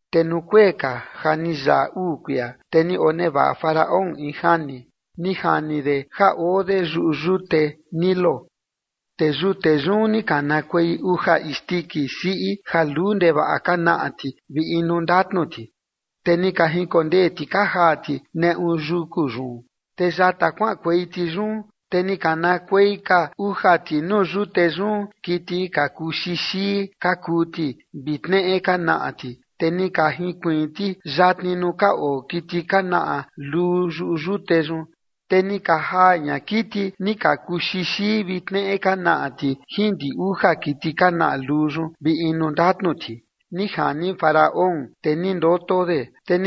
Te nuu kuee ka ja ni yaꞌa uu kuia, te ni onevaꞌa Faraón in jani. Ni jini de ja oo de yuꞌu yute Nilo, te yute yun ni kanakuei uja isndiki siꞌi ja luu ndevaꞌa ka naꞌa ti vi inu ndatnu ti, te ni ka jinkondee ti ka jaa ti neꞌu yuku yun. Te yata kuaꞌankuei ti yun te ni kanakuei ka uja ti nuu yute yun kiti ka kuu xixii ka kuu ti vi tneꞌe ka naꞌa ti, te ni ka jinkuiin ti yatni nuu ka oo kiti ka naꞌa luu yuꞌu yute yun. Te ni ka jaa ña kiti ni ka kuu xixii vi tneꞌe ka naꞌa ti jin ndi uja kiti ka naꞌa luu yun vi inu ndatnu ti, ni jani Faraón, te ni ndoto de.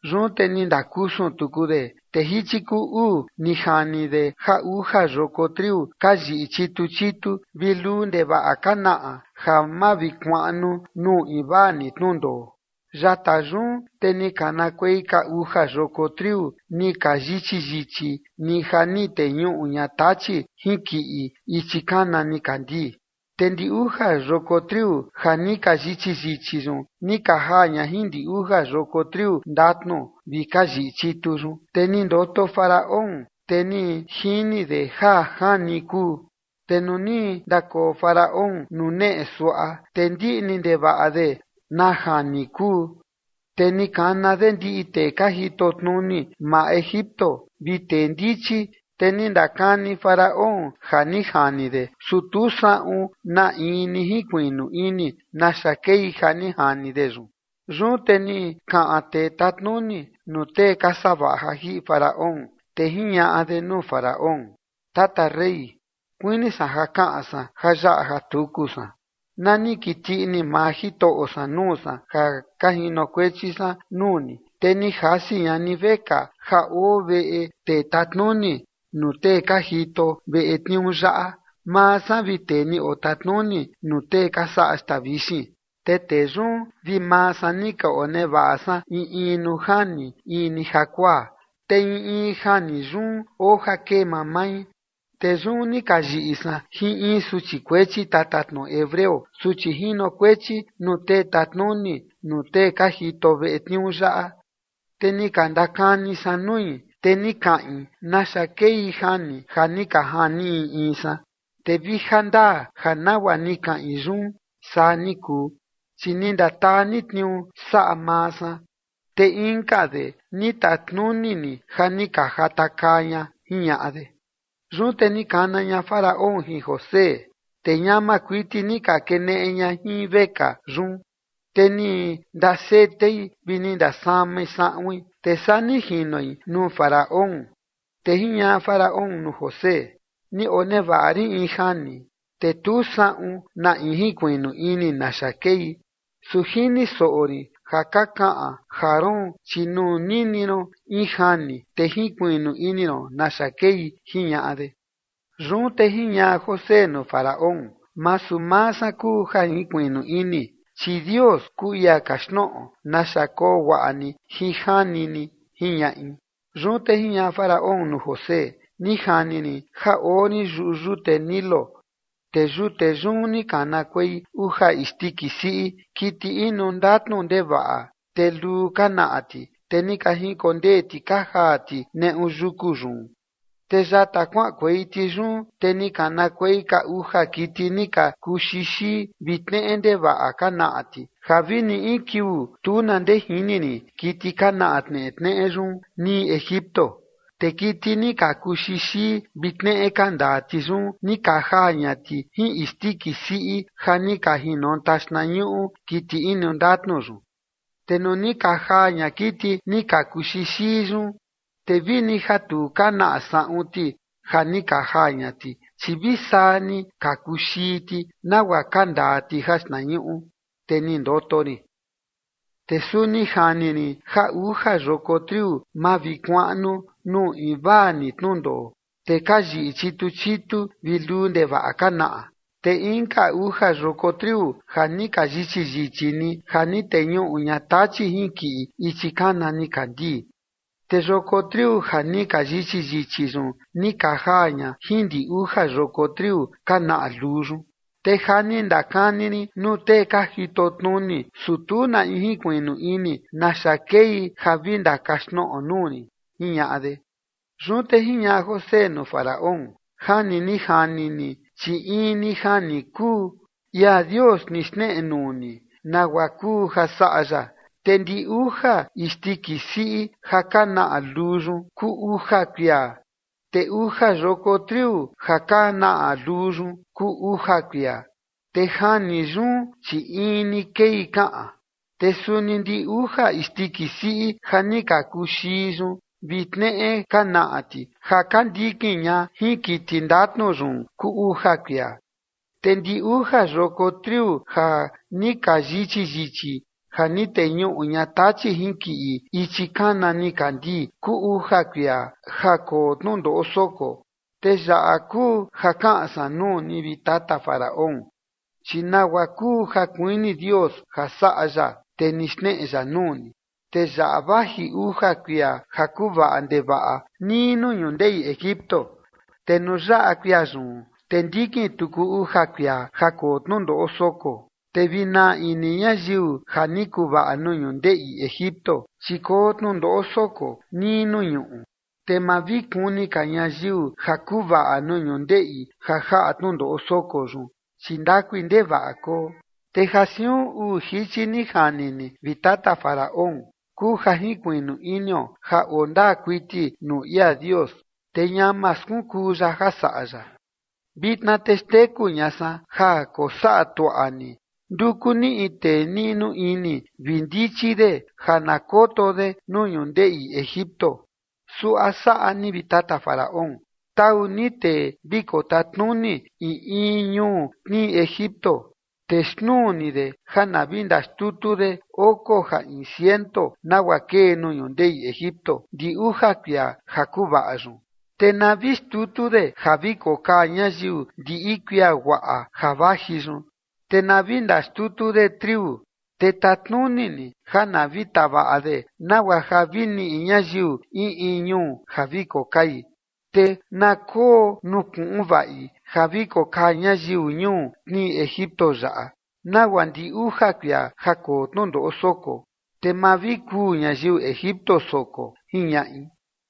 Yun te ni ndakusun tuku de, te jichi kuu uu ni jani de ja uja yoko triu ka yiꞌi chitu chitu vi luu ndevaꞌa ka naꞌa ja mavikuaꞌnu nuu invaa ni tnundoo. Yata yun te ni kanakuei ka uja yoko triu ni ka yichi yichi ni ja ni teñuꞌu ña tachi jinkiꞌi ichi kana nikandii. Te ndi uja yoko triu ja ni ka yichi yichi yun ni ka jaa ña jin ndi uja yoko triu ndatnu vi ka yiꞌi chitu yun. Te ni ndoto Faraón te ni jini de ja jani kuu. Te nuu ni ndakoo Faraón nuu neꞌe suaꞌa, te ndiꞌni ndevaꞌa de na jani kuu, te ni kana de ndiꞌi tee ka jitotnuni maa Egipto vi tee ndichi, te ni ndakani Faraón ja ni jani de, su tu saꞌun na in ni jinkuiꞌnu ini naxa kei ja ni jani de yun. Yun te ni kaꞌan tee tatnuni nuu tee ka savaꞌa ja jiꞌi Faraón, te jiñaꞌa de nuu Faraón: ―Tata rey, kuini san ja kaꞌan san jayaꞌa jatuku san. Na ni kiti ini maa jitoꞌo san nuu san ja ka jinokuechi san nuu ni, te ni jasi ña ni vekaa ja oo veꞌe tee tatnuni nuu tee ka jito veꞌe tniuu yaꞌa, maa san vi tee ni otatnuni nuu tee ka saꞌa xtaa vixin. Te tee yun vi maa san ni ka onevaꞌa san in in nuu jani in ni jakuaa, te in in jani yun oo ja kee mamai. Te yun ni ka yiꞌi san jin in suchi kuechi tatatnoꞌo hebreo suchi jinokuechi nuu tee tatnuni nuu tee ka jito veꞌe tniuu yaꞌa, te ni ka ndakani san nui, te ni kaꞌin naxa kei jani ja ni ka jani in in san. Te vi jandaa ja nagua ni kaꞌin yun saa ni kuu, chi ni ndataa ni tniuu saꞌa maa san, te inka de ni tatnuni ni ja ni ka jatakaa ña ―jiñaꞌa de. Yun te ni kana ña Faraón jin José, te ñama kuiti ni ka keneꞌe ña jin vekaa yun, te ni ndasetei vi ni ndasamai saꞌuin, te saa ni jinoi nuu Faraón. Te jiñaꞌa Faraón nuu José: ―Ni onevaꞌa rin in jani, te tu saꞌun na in jinkuiꞌnu ini naxa kei, su jini soꞌo rin ja ka kaꞌan ja roon, chi nuu nini ron in jani, te jinkuiꞌnu ini ron naxa kei ―jiñaꞌa de. Yun te jiñaꞌa José nuu Faraón: ―Masu maa san kuu ja jinkuiꞌnu ini, chi Dios kuu ia kaxtnoꞌo naxa koo guaꞌa ni jin jani ni ―jiñaꞌi. Yun te jiñaꞌa Faraón nuu José: ―Ni jani rin ja oo rin yuꞌu yute Nilo, te yute yun ni kanakuei uja isndiki siꞌi, kiti inu ndatnu ndevaꞌa, te luu ka naꞌa ti, te ni ka jinkondee ti ka jaa ti neꞌu yuku yun. Te yata kuaꞌankuei ti yun, te ni kanakuei ka uja kiti ni ka kuu xixii vi tneꞌe ndevaꞌa ka naꞌa ti, ja vi ni in kiuu tu na ndee jini rin kiti ka naꞌa tnetneꞌe yun nii Egipto. Te kiti ni ka kuu xixii vi tneꞌe ka ndaa ti yun, ni ka jaa ña ti jin isndiki siꞌi ja ni ka jinonta xtnañuꞌu kiti inu ndatnu yun. Te nuu ni ka jaa ña kiti ni ka kuu xixii yun, te vi ni ja tu ka naꞌa saꞌun ti ja ni ka jaa ña ti, chi vi saa ni ni ka kuu xii ti, nagua ka ndaa ti jaxtnañuꞌu. Te ni ndoto rin. ’Te suni jani rin ja uja yoko triu mavikuaꞌnu nuu invaa ni tnundoo, te ka yiꞌi chitu chitu vi luu ndevaꞌa ka naꞌa. Te inka uja yoko triu ja ni ka yichi yichi ni ja ni teñuꞌu ña tachi jinkiꞌi ichi kana nikandii. Te yoko triu ja ni ka yichi yichi yun ni ka jaa ña jin ndi uja yoko triu ka naꞌa luu yun. Te ja ni ndakani rin nuu tee ka jitotnuni, su tu na in jinkuiꞌnu ini naxa kei ja vi ndakaxtnoꞌo nuu rin ―jiñaꞌa de. Yun te jiñaꞌa José nuu Faraón: ―Jani ni jani ni, chi in ni jani kuu, ia Dios ni xneꞌe nuu ni nagua kuu ja saꞌa ya. Te ndi uja isndiki siꞌi ja ka naꞌa luu yun, kuu uja kuia, te uja yoko triu ja ka naꞌa luu yun, kuu uja kuia. Te jani yun, chi in ni kei kaꞌan. Te suni ndi uja isndiki siꞌi ja ni ka kuu xii yun vi tneꞌe ka naꞌa ti ja ka ndikin ña jin kiti ndatnu yun, kuu uja kuia, te ndi uja yoko triu ja ni ka yichi yichi ja ni teñuꞌu ña tachi jinkiꞌi ichi kana nikandii, kuu uja kuia ja koo tnundoꞌo soko. Te yaꞌa kuu ja kaꞌan san nuu ni, vi tata Faraón, chi nagua kuu ja kuini Dios ja saꞌa ya, te ni xneꞌe ya nuu ni. Te yaꞌa vaji uja kuia ja kuvaꞌa ndevaꞌa nii nuu ñundeꞌi Egipto. Te nuu yaꞌa kuia yun, te ndikin tuku uja kuia ja koo tnundoꞌo soko, te vi naa ini ñayiu ja ni kuvaꞌa nuu ñundeꞌi Egipto, chi koo tnundoꞌo soko nii nuu ñuꞌu. Te ma vi kuni ka ñayiu ja kuvaꞌa nuu ñundeꞌi ja jaꞌa tnundoꞌo soko yun, chi ndakui ndevaꞌa koo. Te ja siun uu jichi ni jani ni, vi tata Faraón, kuu ja jinkuiꞌnu inio ja oo ndaa kuiti nuu ia Dios, te ñama skunkuu ya ja saꞌa ya. Vitna te xteku ña san ja kosaꞌa tuaꞌa ni. Nduku ni in tee niꞌnu ini vi ndichi de ja na koto de nuu ñundeꞌi Egipto. Suaꞌa saꞌa ni, vi tata Faraón: Tau ni tee vi kotatnuni in in ñuu tnii Egipto, te xnuu ni de ja na vi ndaxtutu de oko ja in ciento nagua kee nuu ñundeꞌi Egipto ndi uja kuia ja kuvaꞌa yun. Te na vi xtutu de ja vi kokaa ñayiu ndiꞌi kuia guaꞌa ja vaji yun, te na vi ndaxtutu de triu te tatnuni ni ja na vi tavaꞌa de nagua ja vi niꞌi ñayiu in in ñuu ja vi kokai. Te na koo nuu kuꞌun vaꞌi ja vi kokaa ñayiu ñuu tnii Egipto yaꞌa, nagua ndi uja kuia ja koo tnundoꞌo soko, te ma vi kuu ñayiu Egipto soko ―jiñaꞌi.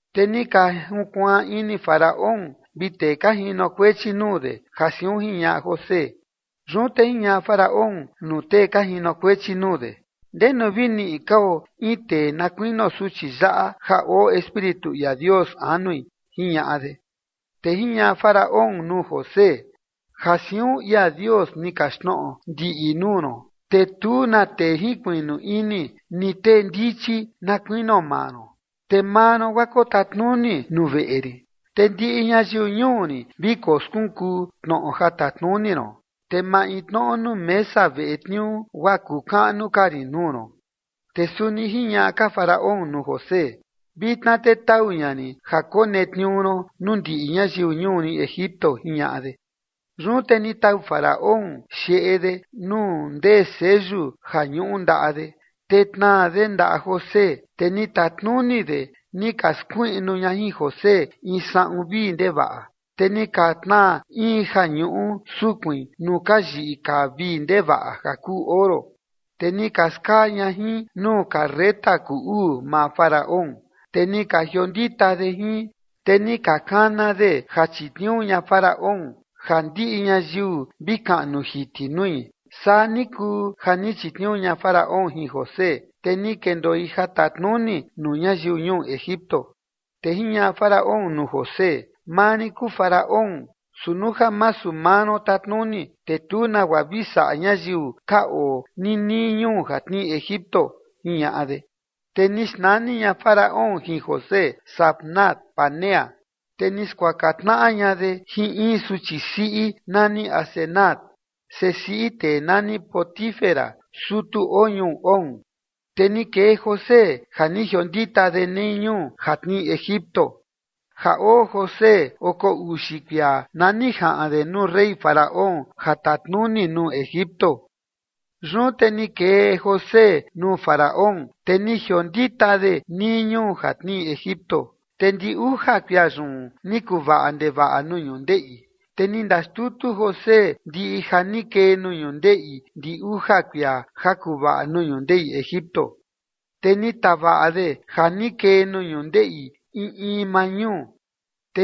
Te ni ka junkuaan ini Faraón vi tee ka jinokuechi nuu de, ja siun jiñaꞌa José. Yun te jiñaꞌa Faraón nuu tee ka jinokuechi nuu de: ―¿Ndenu vi niꞌi kao in tee na kuinio suchi yaꞌa ja oo Espíritu ia Dios anui? ―jiñaꞌa de. Te jiñaꞌa Faraón nuu José: ―Ja siun ia Dios ni kaxtnoꞌo ndiꞌi nuu ron, te tu na tee jinkuiꞌnu ini ni tee ndichi na kuinio maa ron. Te maa ron guaa kotatnuni nuu veꞌe rin, te ndiꞌi ñayiu ñuu rin vi koskunkuu tnoꞌo ja tatnuni ron, te maintnoꞌo nuu mesa veꞌe tniuu guaa kuu kaꞌnu ka rin nuu ron. Te suni jiñaꞌa ka Faraón nuu José: ―Vitna te tau ña rin ja konetniuu ron nuu ndiꞌi ñayiu ñuu rin Egipto ―jiñaꞌa de. Yun te ni tau Faraón xeꞌe de nuu ndee seyu ja ñuꞌu ndaꞌa de, te tnaa de ndaꞌa José, te ni tatnuni de ni ka skuiꞌnu ña jin José in saꞌun vii ndevaꞌa, te ni ka tnaa in ja ñuꞌu sukuin nuu ka yiꞌi kaa vii ndevaꞌa ja kuu oro. Te ni ka skaa ña jin nuu carreta kuu uu maa Faraón, te ni ka jiondita de jin, te ni ka kana de ja chitniuu ña Faraón, ja ndiꞌi ñayiu vi kaꞌnu jiti nui. Saa ni kuu ja ni chitniuu ña Faraón jin José, te ni kendoi ja tatnuni nuu ñayiu ñuu Egipto. Te jiñaꞌa Faraón nuu José: ―Maa rin kuu Faraón, su nuu ja masu maa ron tatnuni, te tu nagua vi saꞌa ñayiu ka oo nii nii ñuu ja tnii Egipto ―jiñaꞌa de. Te ni xnani ña Faraón jin José Zafnat-panea, te ni skuaka tnaꞌa ña de jin in suchi siꞌi nani Asenat, sesiꞌi tee nani Potifera, sutu oo ñuu On. Te ni kee José ja ni jiondita de nii ñuu ja tnii Egipto. Ja oo José oko uxi kuia na ni jaꞌan de nuu rey Faraón ja tatnuni nuu Egipto. Yun te ni kee José nuu Faraón, te ni jiondita de nii ñuu ja tnii Egipto. Te ndi uja kuia yun ni kuvaꞌa ndevaꞌa nuu ñundeꞌi. Te ni ndaxtutu José ndiꞌi ja ni kee nuu ñundeꞌi ndi uja kuia ja kuvaꞌa nuu ñundeꞌi Egipto, te ni tavaꞌa de ja ni kee nuu ñundeꞌi in in maa ñuu.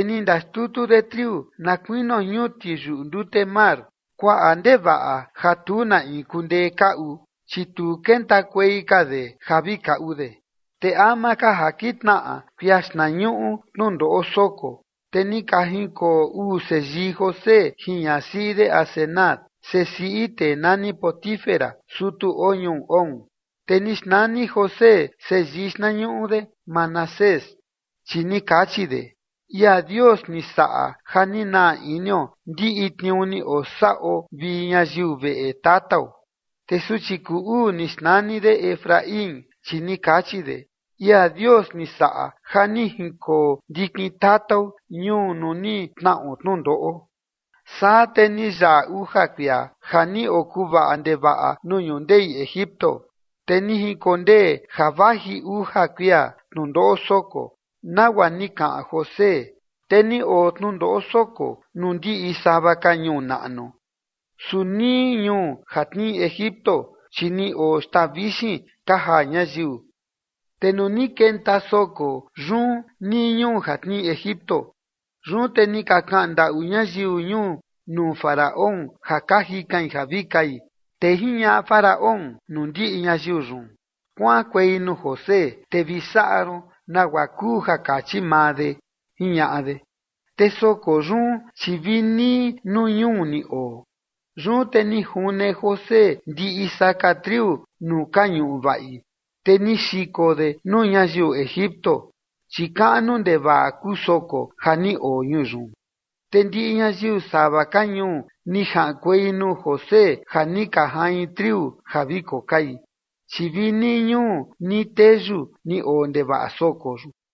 Ni ndaxtutu de triu na kuinio ñuti yuꞌu ndute mar, kuaꞌa ndevaꞌa ja tu na in kundee kaꞌu, chi tu kentakuei ka de ja vi kaꞌu de. Te ama ka ja kitnaꞌa kuia xtnañuꞌu tnundoꞌo soko, te ni ka jinkoo uu seyii José jin ñasiꞌi de Asenat, sesiꞌi tee nani Potifera, sutu oo ñuu On. Te ni xnani José seyii xtnañuꞌu de Manasés, chi ni kachi de: ―Ia Dios ni saꞌa ja ni naa inio ndiꞌi tniuu ni osaꞌo vi ñayiu veꞌe tatao. Te suchi kuu uu ni xnani de Efraín, chi ni kachi de: ―Ia Dios ni saꞌa ja ni jinkoo ndikin tatao ñuu nuu ni tnaꞌo tnundoꞌo. Saa te ni yaꞌa uja kuia ja ni okuvaꞌa ndevaꞌa nuu ñundeꞌi Egipto. Te ni jinkondee ja vaji uja kuia tnundoꞌo soko, nagua ja ni kaꞌan José, te ni oo tnundoꞌo soko nuu ndiꞌi sava ka ñuu naꞌnu, su nii ñuu ja tnii Egipto, chi ni oo xtaa vixin ka jaa ñayiu. Te nuu ni kenta soko yun nii ñuu ja tnii Egipto, yun te ni ka kaꞌan ndaꞌu ñayiu ñuu nuu Faraón ja ka jikain ja vi kai. Te jiñaꞌa Faraón nuu ndiꞌi ñayiu yun: ―Kuaꞌankuei nuu José te vi saꞌa ron nagua kuu ja kachi maa de ―jiñaꞌa de. Te soko yun, chi vi nii nuu ñuu ni oo. Yun te ni june José ndiꞌi saka triu nuu ka ñuꞌu vaꞌi, te ni xiko de nuu ñayiu Egipto, chi kaꞌnu ndevaꞌa kuu soko ja ni oo ñuu yun. Te ndiꞌi ñayiu sava ka ñuu ni jaꞌankuei nuu José ja ni ka jain triu ja vi kokai, chi vi nii ñuu nii teyu ni oo ndevaꞌa soko yun.